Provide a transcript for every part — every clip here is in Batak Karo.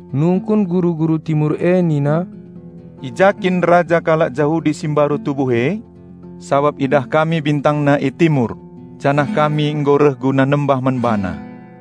Nungkun guru-guru Timur e nina, "I ja kin anak si tubuh raja kalak Jahudi e? Sabap idah kami bintangna arah Timur, janah ate kami ersembah man BaNa."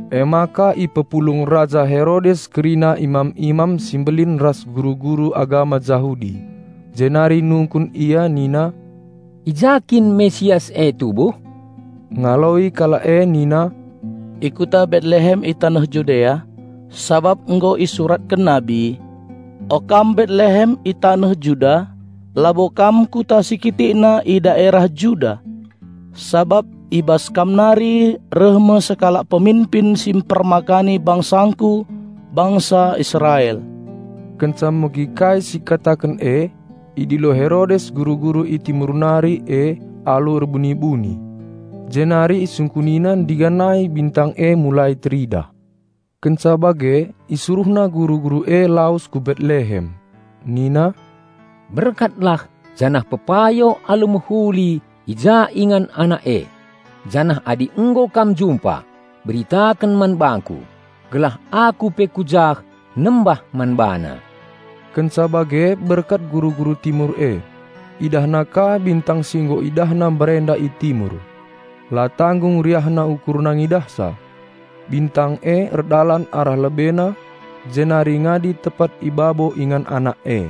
Perbahan si e ipepulung Raja Herodes kerina imam-imam si mbelin ras guru-guru agama Jahudi. Jenari nungkun ia nina, "I ja kin Raja Penampat e tubuh?" Erjabap kalak e nina, "I kuta Betlehem i taneh Judea, sabap nggo isuratken nabi: 'O kam Betlehem i taneh Juda, labo kam kuta si kitikna i daerah Juda; sabap i bas kam nari reh me sekalak peminpin si mpermakani BangsaNgku bangsa Israel.'" Kenca megi kai si ikataken e, idilo Herodes guru-guru i Timur nari e alu erbuni-buni. Jenari isungkunina ndiganai bintang e mulai teridah. Kenca bage isuruhna guru-guru e lawes ku Betlehem. Nina, "Berkatlah janah pepayo alu mehuli i ja ingan anak e, janah adi nggo kam jumpa, beritaken man bangku, gelah aku pe ku jah nembah man BaNa." Kenca bage berkat guru-guru Timur e. Idahna ka bintang si nggo idahna mbarenda i Timur. La tanggung riahna ukurna ngidahsa. Bintang e erdalan arah lebena jenari ngadi tepat i babo ingan anak e.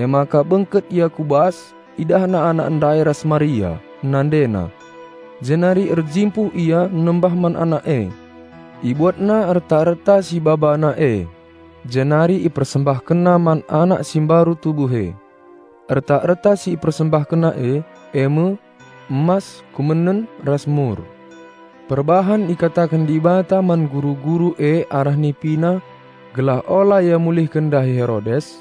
Emaka bengket ia ku bas idahna Anak ndai ras Maria, NandeNa. Jenari erjimpuh ia nembah Anak e. Ibuatna erta-erta si ibabana e, jenari ipersembahkenna man Anak si mbaru tubuh e. Erta-erta si ipersembahkenna e, eme: emas, kumenen ras mur. Perbahan ikataken Dibata man guru-guru e arah nipina gelah ola ia mulihken ndahi Herodes,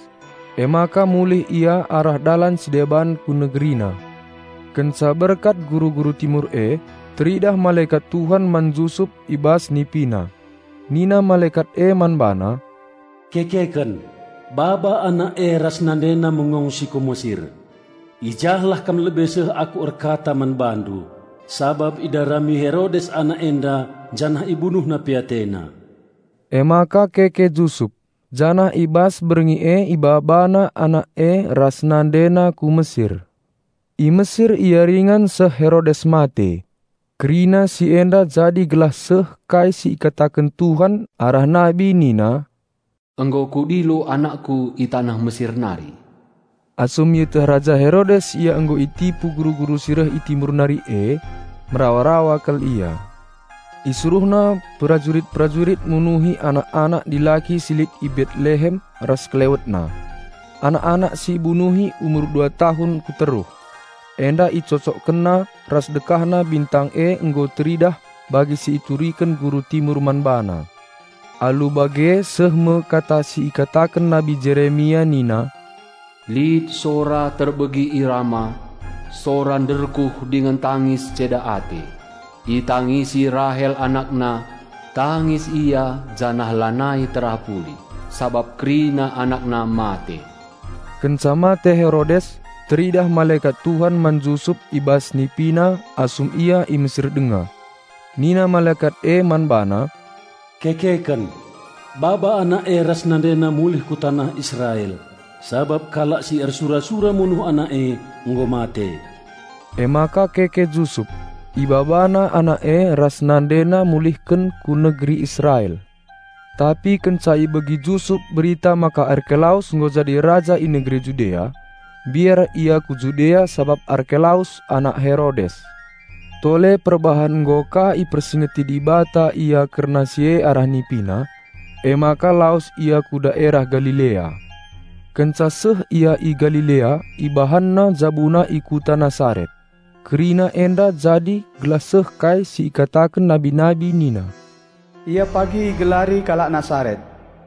emaka mulih ia arah dalan si deban ku negerina. Kenca berkat guru-guru Timur e, teridah malekat Tuhan man Jusup i bas nipina. Nina malekat e man bana, "Kekeken, baba Anak e ras nandena mengongsi ku Mesir. I jahlah kam lebe seh aku erkata man bandu, sabap idarami Herodes anak enda janah ibunuhna pe atena." Emaka keke Jusup, janah i bas berngi e ibabana Anak e ras nandena ku Mesir. I Mesir ia ringan seh Herodes mate. Kerina si enda jadi gelah seh kai si ikataken Tuhan arah nabi nina, "Nggo Kudilo AnakKu i taneh Mesir nari." Asum ieteh Raja Herodes ia nggo itipu guru-guru si reh i Timur nari e, merawa-rawa kal ia. Isuruhna perajurit-perajurit munuhi anak-anak dilaki si lit i Betlehem ras sekelewetna. Anak-anak si ibunuhi umur dua tahun kuteruh. Enda isesuaikenna ras dekahna bintang e nggo teridah bagi si ituriken guru Timur man bana. Alu bage seh me kata si ikataken Nabi Jeremia nina, "Lit sora terbegi i Rama, sora nderkuh dingen tangis ceda ate. Itangisi Rahel anakna, tangis ia janah lanai terapuli, sabap kerina anakna mate." Kenca mate Herodes, teridah malekat Tuhan man Jusup i bas nipina asum ia i Mesir denga. Nina malekat e man bana, "Kekeken, baba Anak e ras nandena mulih ku taneh Israel, sabap kalak si ersura-sura munuh Anak e nggo mate." Emaka keke Jusup, ibabana Anak e ras nandena mulihken ku negeri Israel. Tapi kenca ibegi Jusup berita maka Arkelaus nggo jadi raja i negeri Judea, mbiar ia ku Judea sabap Arkelaus anak Herodes. Tole perbahan nggo ka ipersingeti Dibata ia kerna si e arah nipina, emaka lawes ia ku daerah Galilea. Kenca seh ia i Galilea ibahanna jabuna i kuta Nasaret. Kerina enda jadi gelah seh kai si ikataken nabi-nabi nina, "Ia pagi igelari kalak Nasaret."